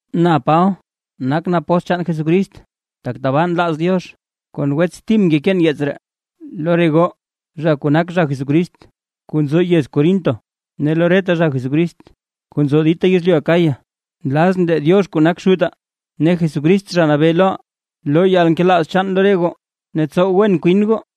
Na Paba, nakʼn apóstl chaan Jesucrist tak tabaa nlaaz Diox. Kon wets Tim ngekeen yeets ree, lo re goo zha kuu nak zha Jesucrist kuu nzo yez Corinto, ne lo reta zha Jesucrist kuu nzo dita yezlyu Acaya. Nlazʼn lee Diox kuu nak Xutaa, ne Jesucrist Zha Nabee loʼaa, loo yalnkelaaz chaan lo re goo ne tsow wen kwin goo.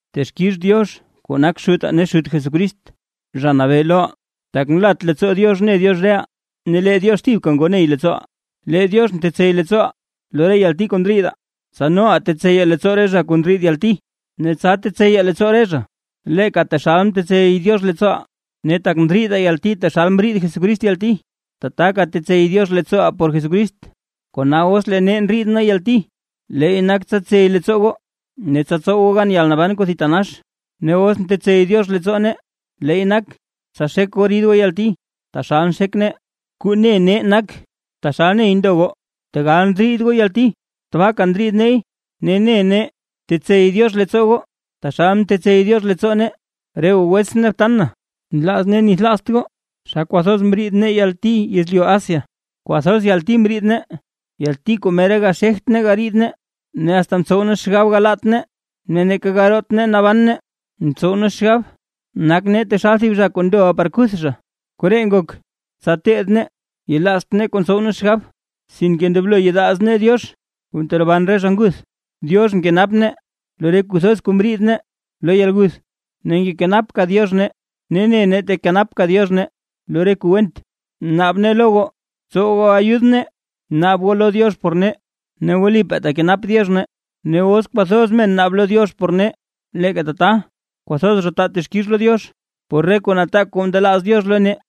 Texkix Diox kuu nak Xutaa ne Xut Jesucrist, Zha Nabee loʼaa, tak nlat leettsoo Diox ne Diox reʼaa, ne lee Diox thibka ngo ney leettsooʼaa. Lee Diox ntetsey leettsooʼaa lo re yalti kuu ndriidaa, tsa noʼaa tetseyaa leettsoo re zha kuu ndriid yalti; ne tsa tetseyaa leettsoo re zha, leeka taxal mtetsey Diox leettsooʼaa. Ne tak ndriidaa yalti taxal mriid Jesucrist yalti, tataka tetsey Diox leettsooʼaa por Jesucrist. Kona os lee nee ndriid nee yalti, leey nak tsa tsey leettsoo goo, ne tsa tsow goo gan yalnaban kuu thitanax; ne os ntetsey Diox leettsoo nee, leey nak tsa xek goo rid goo yalti, taxal nxek nee. Kuu ne nee nak; taxal ney ndo goo tegal ndriid goo yalti, tabaaka ndriid neey, ne ne nee tetetsey Diox leettsoo goo, taxal ntetsey Diox leettsoo nee. Re goo wetsʼn ne btan na, nlaaz nee nithlaazt goo xa kwathoz mriid nee yalti yezlyu Asia. Kwathoz yalti mriid nee, yalti kuu mera gaxegt nee gariid nee, ne asta mtsow nee xgab galaat nee ne neeka garoot nee naban nee. Mtsow nee xgab nak nee taxal thib zha kuu ndoʼa par kuth zha. Koree ngok, tsa teed nee, yelaazt nee kuu ntsow nee xgab, sinke ndoblo yelaaz nee Diox kuu nteroban re zha nguth. Diox mkenap nee lo re kuu thoz kuu mriid nee lo yalguth, ne ngekenapka Diox nee, ne ne nee tekenapka Diox nee lo reta kuu went. Naab nee lo goo, tsow goo ayud nee naab goo lo Diox por nee, ne wlipaa tekenap Diox nee. Ne os kwathoz men naab lo Diox por nee, leeka tata kwathoz zha taa texkix lo Diox, por re kuu nataak kuu ndelaaz Diox lo nee.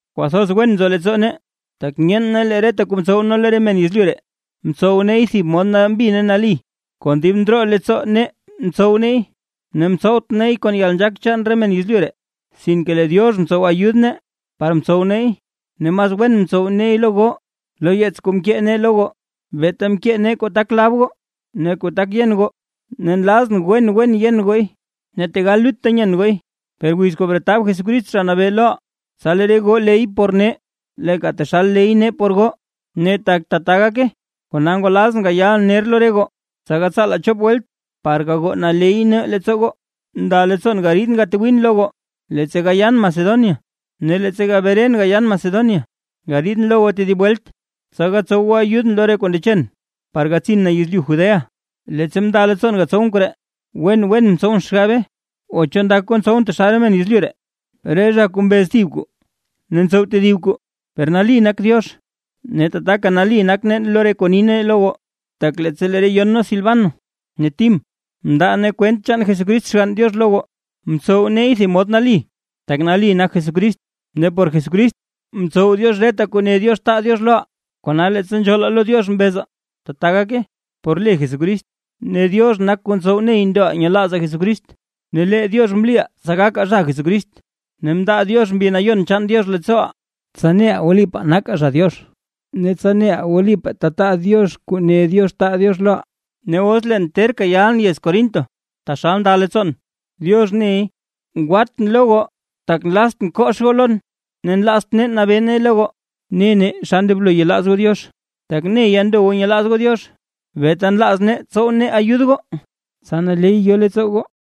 Kwathoz wen nzo leettsoo nee; tak nyeen nee lee reta kuu mtsow nee lo re men yezlyu ree, mtsow neey thib mod nali ne nambi, kon dib ndroo leettsoo nee mtsow neey; ne mtsowt neey kon yalnzhaak chaan re men yezlyu ree, sinke lee Diox mtsow ayud nee par mtsow neey ne mas wen mtsow neey lo goo. Lo yeets kuu nkee nee lo goo, beeta nkee nee kuu tak lab goo ne kuu tak yen goo. Ne nlazʼn wen wen yen gooy. Ne tegal lutta nyen gooy, per wiz kuu bretab Jesucrist Zha Nabee loʼaa, tsa lee re goo ley goo por nee, leeka taxal ley nee por goo. Ne tak tata gake, kona ngwalazʼn gayalʼn ner lo re goo, tsa gatsaalaa chop welt par gagoo naley nee leettsoo goo. Nda leettsoon gariidʼn gatwiin lo goo, leettsa gayan Macedonia, ne leettsa gabren gayan Macedonia gariidʼn lo goo tedib welt. Tsa gatsow goo ayudʼn lo re kuu ndechen par gatsin na yezlyu Judea. Leettsa mnda leettsoon gatsowʼn koree, wen wen mtsowʼn xgabe. O ¿cho ndak goo ntsowʼn taxal re men yezlyu ree, re zha kuu mbez tsow thib kuu ne ntsow tedib kuu? Per nali nak Diox, ne tataka nali nak nee lo re kuu ni nee lo goo. Tak leettsa lee re yon nee Silvano ne Tim mndaa nee kwent chaan Jesucrist Xgann Diox lo goo, mtsow neey thib mod nali tak nali nak Jesucrist. Ne tak por Jesucrist ntsow Diox reta kuu ne Diox taa Diox loʼaa, kona leettsa nzhoolaa lo Diox mbezaa: “Tata gake” por le Jesucrist. Ne Diox nak kuu ntsow ney ndoʼaa nyelaazaa Jesucrist. Ne lee Diox mliʼaa tsa gakaa zha Diox. Ne mndaa Diox Mbi Nayon chaan Diox leettsooʼaa, tsa neʼaa wlipaa nakaa zha Diox ne tsa neʼaa wlipaa tetaa Diox kuu ne Diox taa Diox loʼaa. Ne os leen terka yalʼn yez Corinto taxal nda leettsoon, Diox ney, ngwatʼn lo goo tak nlaztʼn kox goo lon. Ne nlaazt nee nabee nee lo goo ne nee xa ndoblo yelaaz goo Diox, tak neya ndo goo nyelaaz goo Diox, beeta nlaaz nee tsow nee ayud goo, tsa naley yo leettsoo goo.